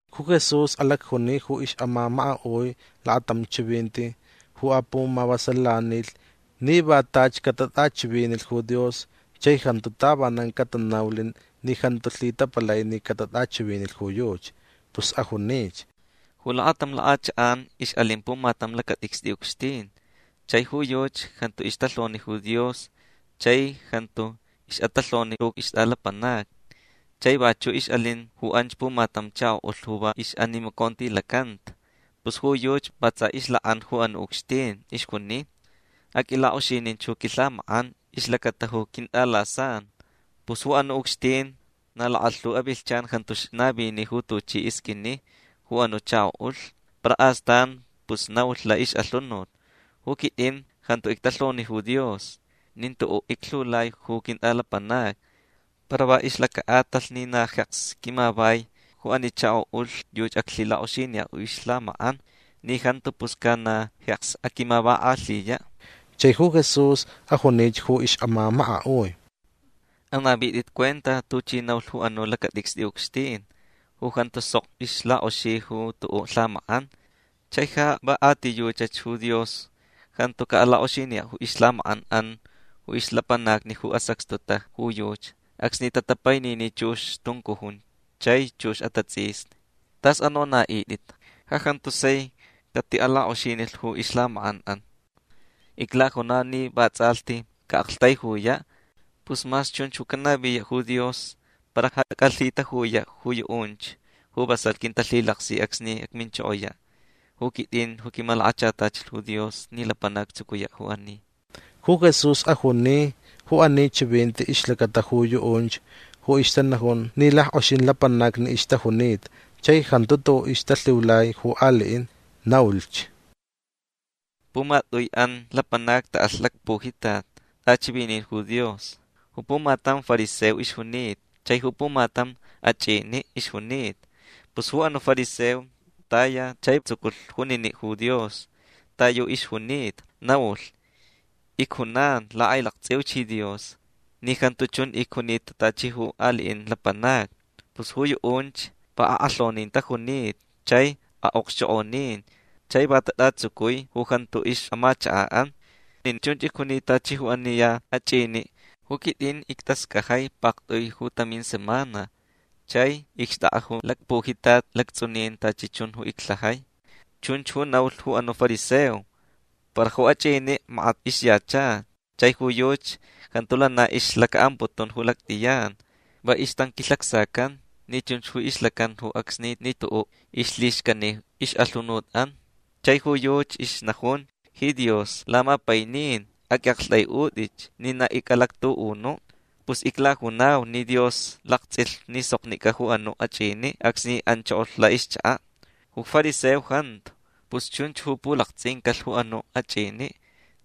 Ju Jesús alacjuni ju ixʼamamakaʼui lakatam chivinti ju apumavasalanilh ni va tachi catatʼachivinilh ju Dios chai jantu tavanan catanaulh ni jantu lhitapalai ni catatʼachivinilh ju yuchi. Pus ajunich: ―Ju lakatam lakʼachakʼan ixʼalin pumatam lacatʼicstʼi ucxtin. Chai ju yuchi jantu ixtalhoni ju Dios chai jantu ixʼatalhoni ju ixtʼalapanacni. Chai vachuʼ ixʼalin ju anch pumatam chakoʼulh ju va ixnimacontilacanta. Pus ju yuchi va tsa ixlakʼan ju anuʼ ucxtin. Ixjuni: “Aqʼuilakʼoxininch ju quilhamakʼan ixlacata ju quintʼalasan”. Pus ju anuʼ ucxtin na lakalhu avilhchan jantu ixnavini ju tuchi isqʼuini ju anuʼ chakoʼulh. Para astan pus naulh laʼixʼalhunut: “Ju quitʼin jantu ictalhoni ju Dios nin tuʼuʼ iclhiulai ju quintʼalapanacni. Para va ixlacaʼatalh ni na jeks quimavai ju ani chakoʼulh yuchi aclhilakʼoxiniyaʼ ju ixlhamakʼan. Ni jantu pus ca na jeks aquimavakʼalhiyaʼ”. Chai ju Jesús ajunich ju ixʼamamakaʼui: ―Anavitʼit cuenta tuchi naulh ju anuʼ lacatʼicstʼi ucxtin ju jantu sok ixlakʼoxi ju tuʼuʼ lhamakʼan. Chai ja va a ti yuchach ju Dios jantu caʼalakʼoxiniyaʼ ju ixlhamakʼanʼan ju ixlapanacni ju asacxtuta ju yuchi acsni tatapainini chux tuncujun chai chux atatsʼisni. Tʼas anonaʼitʼit. Ja jantu sai catiʼalakʼoxinilh ju ixlhamakʼanʼan. Iclajunau ni vatsʼalhti caʼaʼaktaijuyaʼ. Pus mas chunch ju canaviyaʼ ju Dios para ja acʼalhitajuyaʼ ju yuʼunch ju vasalh quintalhilaksi acsni acminchokoyaʼ ju quitʼin ju quimalakachatachilh ju Dios ni lapanac actsucuyaʼ ju ani. Ju Jesús ajuni ju ani chivinti ixlacata ju yuʼunch ju ixtanajun ni lackʼoxin lapanacni ixtajunita chai jantu tuʼu ixtalhiulai ju aliʼin. Naulhch: ―Pumatʼuiʼan lapanacni taʼalh lacpujitat tʼachivinin ju Dios. Ju pumatam fariseo ixjunita chai ju pumatam achʼiniʼ ixjunita. Pus ju anuʼ fariseo taya chai tsuculh juniniʼ ju Dios ta yu ixjunita. Naulh: “Icjunan lakʼailaktsʼiuch ji Dios ni jantu chun icjunita tachi ju aliʼin lapanacni. Pus ju yuʼunch va akʼalhonin tajunita chai aʼokxchokʼonin chai va tatʼatsucui ju jantu ixʼamachakaʼan. Nin chunch icjunita tachi ju ani ya achʼiniʼ. Ju quitʼin ictascajai paktʼui ju tamin semana. Chai icxtʼakʼa ju lacpujitat lactsʼunin tachi chun ju iclhajai”. Chunch ju naulh ju anuʼ fariseo. Para ju achʼiniʼ makat ixyacha. Chai ju yuchi jantu lana ixlacaʼamputun ju lactʼiyan. Va ixtanquilhacsacan ni chunch ju ixlacan ju acsni ni tuʼuʼ ixlhixcani ixʼalhunutʼan. Chai ju yuchi ixnajun: “Ji Dios lamapainin aqʼuiʼaktʼaiʼutʼich ni na icʼalactuʼunuʼ”. Pus iclajunau ni Dios laktsʼilh ni soknicʼa ju anuʼ achʼiniʼ acsni anchokolh laʼixchakaʼ. Ju fariseo jantu. Pus chunch ju pulaktsʼincalh ju anuʼ achʼiniʼ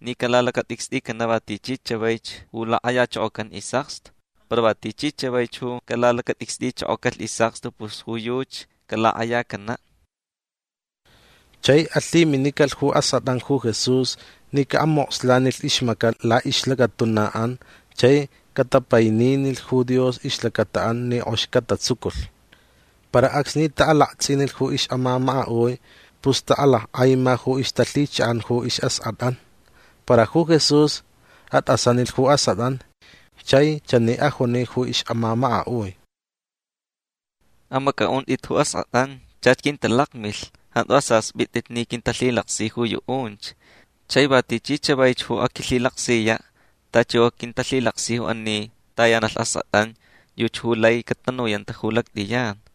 ni calalacatʼicstʼicanaʼ va tichi chavaich ju lakʼayachokocan isʼakstu. Para va tichi chavaich ju calalacatʼicstʼichokocalh isʼakstu pus ju yuchi calakʼayacanaʼ. Chai alhiminicalh ju askʼatʼan ju Jesús ni caʼamokslanilh ixmacaʼ laʼixlacatunaʼan chai catapaininilh ju Dios ixlacataʼan ni kʼox catatsuculh. Para acsni taʼalaktsʼinilh ju ixʼamamakaʼui pus taʼalackʼaima ju ixtalhichaʼan ju isʼaskʼatʼan. Para ju Jesús atʼasanilh ju askʼatʼan chai chani ajuni ju ixʼamamakaʼui: ―Amacʼaʼuntʼit ju askʼatʼan. Chach quintalakmilh. Jantu asaspʼitʼit ni quintalhilaksich juyuʼunch. Chai va tichi chavaich ju aquilhilaksiyaʼ tachi ju quintalhilaksi ju ani tayanalh askʼatʼan yuchi ju lai catanuyanta ju lactʼiyan.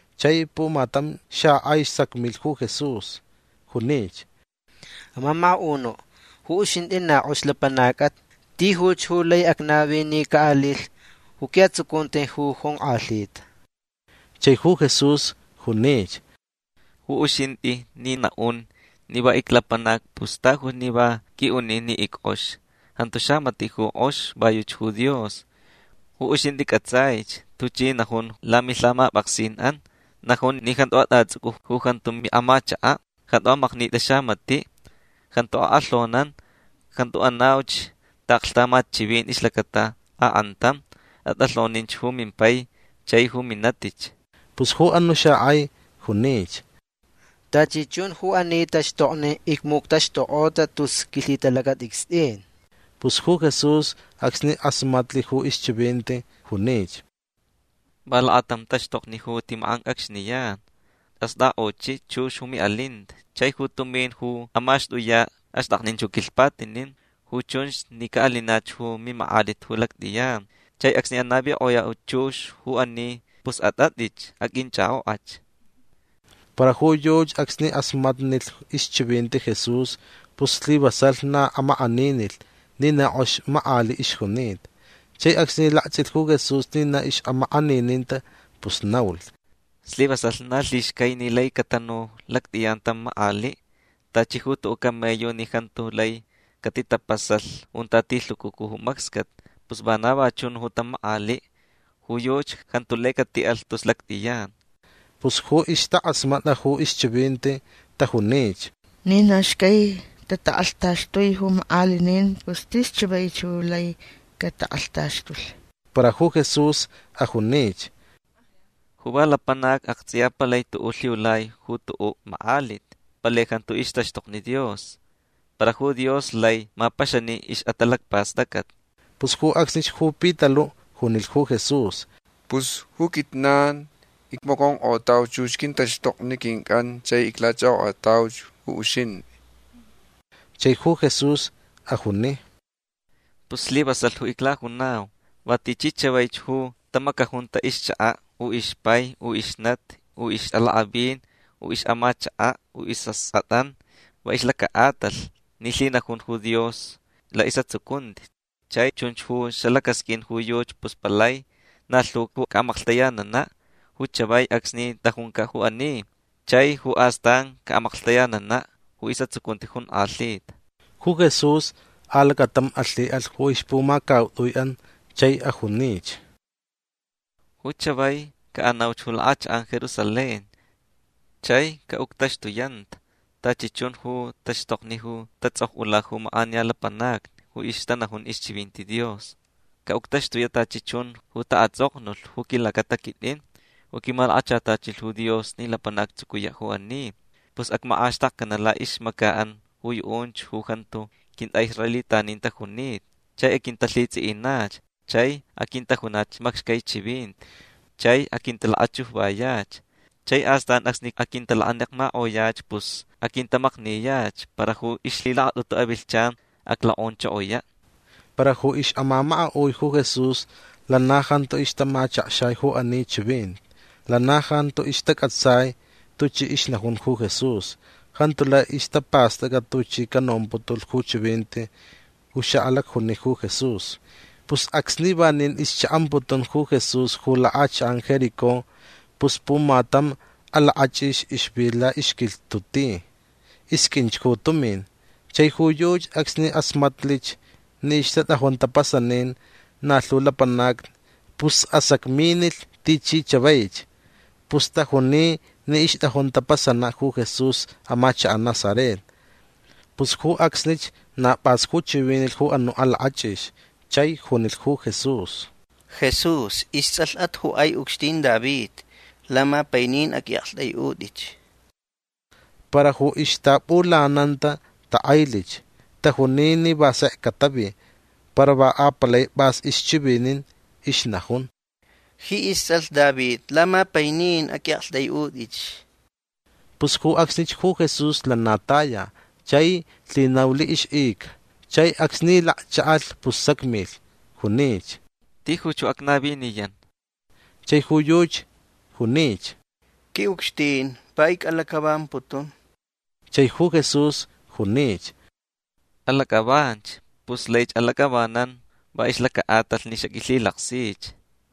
Chai pumatam xakʼai sacmilh ju Jesús. Junich: ―Amamakaʼunuʼ ju uxintʼi na kʼox lapanacʼat. Tijuch ju lai acnavi ni caʼalilh ju quiʼatsucunti ju jonkʼalhita. Chai ju Jesús junich: ―Ju uxintʼi ni naʼun ni va iclapanac pus tajuch ni va qʼuiʼuni ni ickʼox. Jantu xamatiʼ ju kʼox. Va yuchi ju Dios. Ju uxintʼi cʼatsʼaich tuchi najun lamilhamapʼaksinʼan. Najun ni jantu atʼatsʼucʼu ju jantu miʼamachakaʼ. Jantu amaknitʼi xamatiʼ. Jantu akʼalhonan. Jantu anauch taʼaklhtamat chivinti ixlacata akʼantam. Atʼalhoninch ju mimpai chai ju minatich. Pus ju anuʼ xakʼai junich: ―Tachi chun ju ani taxtokni icmuctaxtukʼota tus quilhitalacatʼicstʼin. Pus ju Jesús acsni kʼasmatnilh ju ixchivinti junich: ―Va lakatam taxtokni ju tʼimakʼancʼacxniyan. Astʼakʼochiʼ chux ju miʼalinta chai ju tumin ju amaxtʼuyaʼ axtʼaknin ju quilhpatinin. Ju chunch ni caʼalinach ju mimakʼalit ju lactʼiyan. Chai acsni anavikʼoyaʼ chux ju ani pus atʼatʼich. Aqʼuinchʼakʼokʼach. Para ju yuchi acsni kʼasmatnilh ixchivinti Jesús pus slivasalh na amakʼaninilh ni na kʼox makʼaliʼ ixjunita. Chai acsni laktsʼilh ju Jesús ni na ixʼamakʼanininta pus naulh: ―Slivasalh na lhixcai ni lai catanu lactʼiyan tam makʼaliʼ. Tachi ju tuʼuʼ camello ni jantu lai catitapasalh junta tilhucucu ju macscat pus vana va chun tam makʼaliʼ. Ju yuchi jantu lai catiʼalh tus lactʼiyan. Pus ju ixtakʼasmatʼa ju ixchivinti tajunich: ―Ni na xcai tatakʼalhtaxtui ju makʼalinin pus tis chavaich ju lai catakʼalhtaxtulh. Para ju Jesús ajunich: ―Ju va lapanac aktsʼiya palai tuʼuʼ lhiulai ju tuʼuʼ makʼalit. Palai jantu ixtaxtokni Dios. Para ju Dios lai mapaxani ixʼatalacpastʼacʼat. Pus ju acsnich ju Pitaluʼ junilh ju Jesús: ―Pus ju quijnan icmaconkʼotauch chux quintaxtokni quincʼan chai iclachʼakʼokʼatauch ju uxintʼi. Chai ju Jesús ajuni: ―Pus slivasalh ju iclajunau. Va tichi chavaich ju tamacajunta ixchakaʼ u ixpai u ixnati u ixʼalakʼavin u ixʼamachakaʼ u isʼaskʼatʼan va ixlacaʼatalh ni lhinajun ju Dios laʼisʼatsucunti chai chunch ju xalacasqʼuin ju yuchi pus palai na lhu ju caʼamaklhtayananaʼ ju chavai acsni tʼajuncaʼ ju ani chai ju astan caʼamaklhtayananaʼ ju isʼatsucunti jonkʼalhita. Ju Jesús alacatam alhiʼalh ju ixpumacautʼuiʼan chai ajunich: ―Ju chavai caʼanauch ju lakʼachakʼan Jerusalén. Chai caʼuctaxtuyanta tachi chun ju taxtokni ju tatsʼokʼula ju makʼaniya lapanacni ju ixtanajun ixchivinti Dios. Caʼuctaxtuyaʼ tachi chun ju taʼatsʼoknulh ju quilacata quitʼin ju quimalakachatachilh ju Dios ni lapanac actsucuyaʼ ju ani. Pus acmakʼaxtakcananta laʼixmacaʼan ju yuʼunch ju jantu quintʼaʼisraelitanin tajunita. Chai aquintalhitsʼiʼinach. Chai aquintajunach macxcai chivinti. Chai aquintalakachujvayach. Chai astan acsni aquintalakanekmakʼoyach pus aquintamakniyach. Para ju ixlhilakatʼutu avilhchan aclokʼonchokoyaʼ. Para ju ixʼamamakaʼui ju Jesús lana jantu ixtamachakxai ju ani chivinti. Lana jantu ixtacʼatsai tuchi ixnajun ju Jesús. Jantu lai ixtapastʼacʼa tuchi canomputulh ju chivinti ju xaʼalacjuni ju Jesús. Pus acsni vanin ixchaʼamputun ju Jesús ju lakʼachakʼan Jericó pus pumatam alakʼachʼix ixvi laʼixquilhtuʼ ti. Isqʼuinch ju tumin. Chai ju yuchi acsni kʼasmatlich ni ixtatʼajun tapasanin na lhu lapanacni pus asacminilh tichi chavaich. Pus tajuni ni ixtʼajun tapasanaʼ ju Jesús amachakaʼ Nazaret. Pus ju acsnich na pʼas ju chivinilh ju anuʼ alakʼachʼix chai junilh ju Jesús: ―Jesús istsʼalhʼat ju kʼai ucxtin David. Lamapainin aqʼuiʼaktʼaiʼutʼich. Para ju ixtaʼapʼulananta takʼailich. Tajuni ni va sek catavi. Para va apalai pʼas ju ixchivinin. Ixnajun: ―Ji istsʼalh David lamapainin aqʼuiʼaktʼaiʼutʼich. Pus ju acsnich ju Jesús lana taya. Chai lhinaulh ixʼica. Chai acsni lakchaʼalh pus sacmilh. Junich: ―Tijuch ju acnaviniyan. Chai ju yuchi junich: ―Quiʼucxtin va icʼalacʼavamputun. Chai ju Jesús junich: ―Alacʼavanch. Pus laich alacʼavanan va ixlacaʼatalh ni xaqʼuilhilaksich.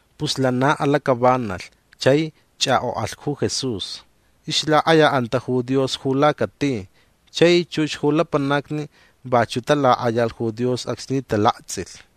Pus lana alacʼavanalh chai chʼakʼokʼalh ju Jesús. Ixlakʼayaʼanta ju Dios ju lacati. Chai chux ju lapanacni vachuʼ talakʼayalh ju Dios acsni talaktsʼilh.